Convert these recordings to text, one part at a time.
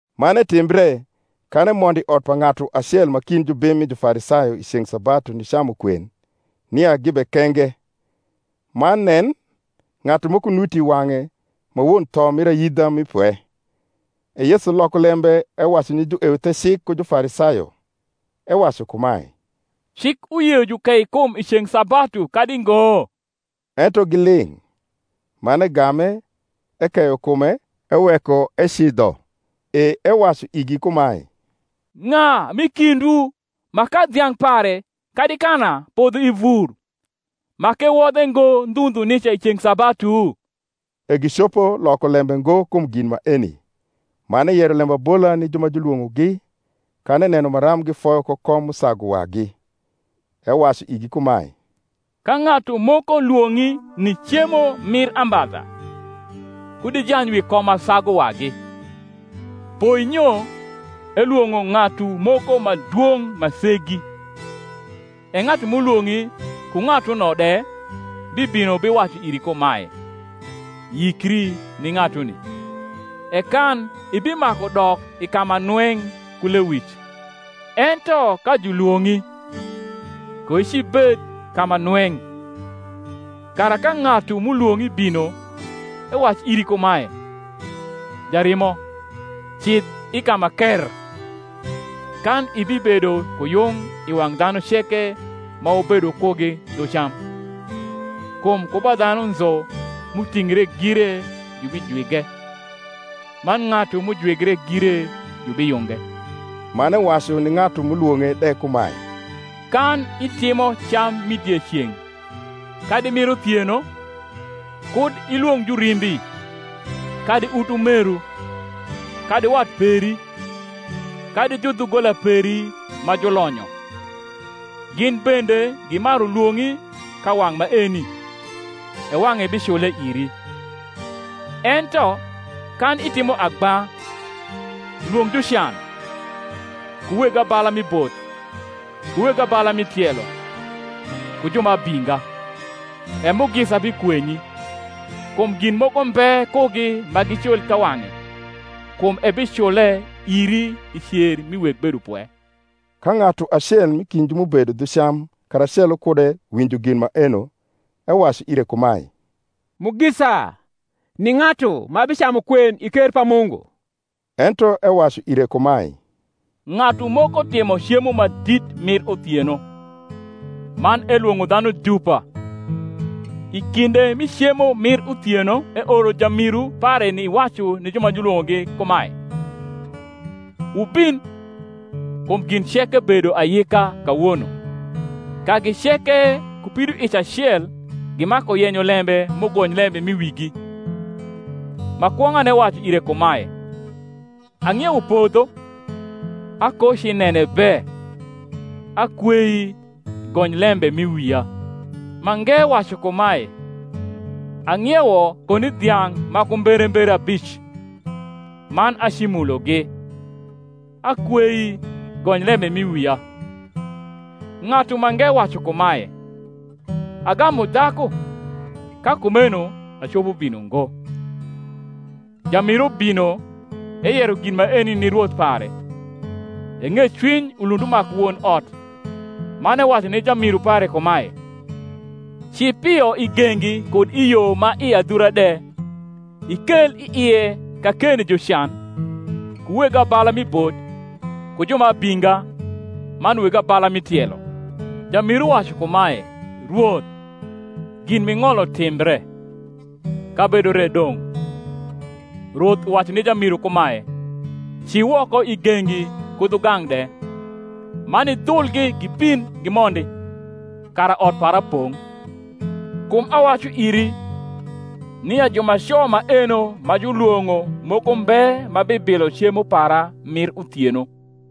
Man etimbre, kan emondo i ot pa ng’atu acel ma kind jubim mi Jufarisayo i ceng’ sabatu nicamu kwen, nia gibekenge. Man nen, ng’atu moko nuti i wang’e ma won tho mir ayidha mi pwe. E Yesu loko lembe ewacu ni jueuthecik ku Jufarisayo, ewacu kumae, Cik uyio jukei kum i ceng’ sabatu, kadi ngo? Ento giling’. Man egame, ekeyo kume, eweko ecidho. E ewacu igi kumae, Ng’a m’i kindwu ma ka dhiang’ pare kadi kana podho i vur, ma k’ewodhe ngo ndhu ndhu nica i ceng’ sabatu? E gicopo loko lembe ngo kum gin maeni. Man eyero lembabola ni ju ma julwong’ogi kan eneno maram gifoyo ko kom m’usagu wagi; ewacu igi kumae, Ka ng’atu moko lwong’i ni cemo mir ambadha, kud ijany wi kom ma sagu wagi; poinyo elwong’o ng’atu moko ma dwong’ ma segi, e ng’atu m’ulwong’i ku ng’atuno de bibino biwacu iri kumae, Yikri ni ng’atuni; e kan ibimaku dok i ka ma nweng’ ku lewic. Ento ka julwong’i, koicibed ka ma nweng’; kara ka ng’atu m’ulwong’i bino, ewac iri kumae, Jarimo, cidh i ka ma krr: kan ibibedo ku yung i wang’ dhanu ceke ma wubedo kugi dhu cam. Kum ku ba dhanu nzu m’utingre gire jubijwige: man ng’atu m’ujwigre gire jubiyunge. Man ewacu ni ng’atu m’ulwong’e de kumae, Kan itimo cam mi dieceng’ kadi mir uthieno, kud ilwong’ jurimbi, kadi utumeru, kadi wat peri, kadi judhugola peri ma julonyo; gin bende gimaru lwong’i ka wang’ maeni, e wang’e bicule iri. Ento kan itimo agba, lwong’ jucan, ku weg abala mi bot, ku weg abala mi tielo ku ju ma abinga: e mugisa bikwenyi: kum gin moko mbe kugi ma gicul kawang’e: kum ebicule iri i cer mi weg bedopwe. Ka ng’atu acel m’i kind ju m’ubedo dhu cam karacelo kude winjo gin maeno, ewacu ire kumae, Mugisa ni ng’atu ma bicamu kwen i ker pa Mungu. Ento ewacu ire kumae, Ng’atu moko timo cemo ma dit mir uthieno; man elwong’o dhanu dupa: i kinde mi cemo mir uthieno eoro jamiru pare niwacu ni ju ma julwong’ogi kumae, Wubin; kum gin ceke bedo ayika kawono. Kagi ceke ku pidoic acel gimaku yenyo lembe m’ugony lembe m’i wigi. Ma kwong’ane wacu ire kumae, Ang’iewo podho, akocinene be; akweii gony lembe m’i wia. Mange wacu kumae, Ang’iewo koni dhiang’ ma ku mberembere abic, man acimulogi; akweii gony lembe m’i wia. Ng’atu mange wacu kumae, Agamu dhaku, ka kumeno acopo bino ngo. Jamiru bino, eyero gin maeni ni rwoth pare. E ng’ecwiny ulund umaku won ot, man ewacu ni jamiru pare kumae, Ci pio i gengi kud i yo ma i adhura de, ikel i ie kakeni jucan, ku weg abala mi bot, ku ju ma abinga, man weg abala mi tielo. Jamiru wacu kumae, Rwoth, gin m’ing’olo timbre, kabedo re dong’. Rwoth uwacu ni jamiru kumae, Ci woko i gengi ku dhugang’ de, man idhulgi gibin gimondi, kara ot para pong’. Kum awacu iri, nia jumaco maeno ma julwong’o moko mbe ma bibilo cemo para mir uthieno.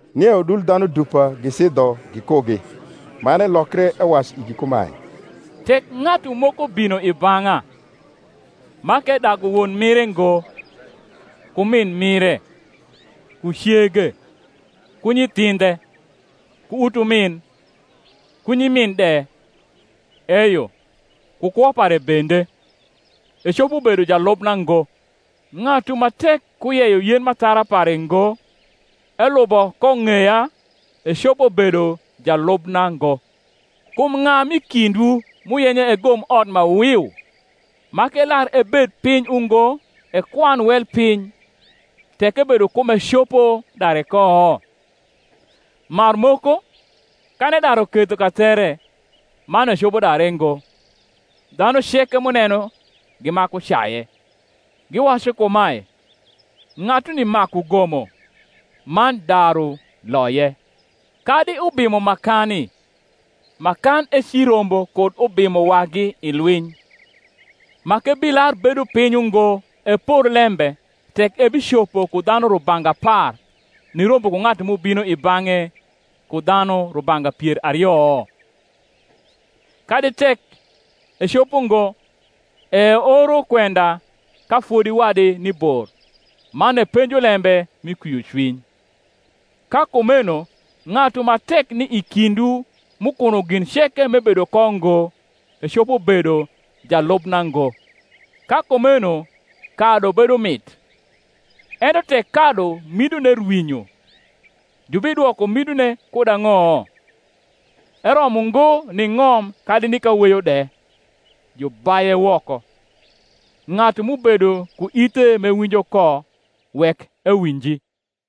Nie udul dhanu dupa gicidho gikugi; man elokre, ewacu igi kumae, Tek ng’atu moko bino i bang’a, ma k’edagu won mire ngo, ku min mire, ku cege, ku nyithindhe, ku utumin, ku nyimin de, eyo, ku kwo pare bende, ecopo bedo jalubna ngo. Ng’atu ma tek kuyeyo yen m’athara pare ngo, elubo ko ng’eya, ecopo bedo jalubna ngo. Kum ng’a m’i kindwu, m’uyenyo egom ot ma wiu, ma k’elar ebed piny ungo ekwan wel piny, tek ebedo ku m’ecopo dare ko? Marmoko, kan edaru ketho kathere, man ecopo dare ngo, dhanu ceke m’uneno gimaku caye, giwacu kumae, Ng’atuni maku gomo, man daru loye. Kadi ubimo ma kani, ma kan ecirombo kud ubimo wagi i lwiny, ma k’ebilar bedo piny ungo epor lembe tek ebicopo ku dhanu rubanga apar nirombo ku ng’atu m’ubino i bang’e ku dhanu rubanga pier ario? Kadi tek ecopo ngo, e eoro kwenda ka fodi wadi ni bor, man epenjo lembe mi kwiocwiny. Ka kumeno ng’atu ma tek ni i kindwu m’ukuno gin ceke m’ebedo ko ngo, ecopo bedo jalubna ngo. Ka kumeno kadu bedo mit: ento tek kadu midone rwinyo, jubidwoko midone kud ang’o? Eromo ngo ni ng’om kadi ni kaweyo de: jubaye woko. Ng’atu m’ubedo ku ithe m’ewinjo ko, wek ewinji.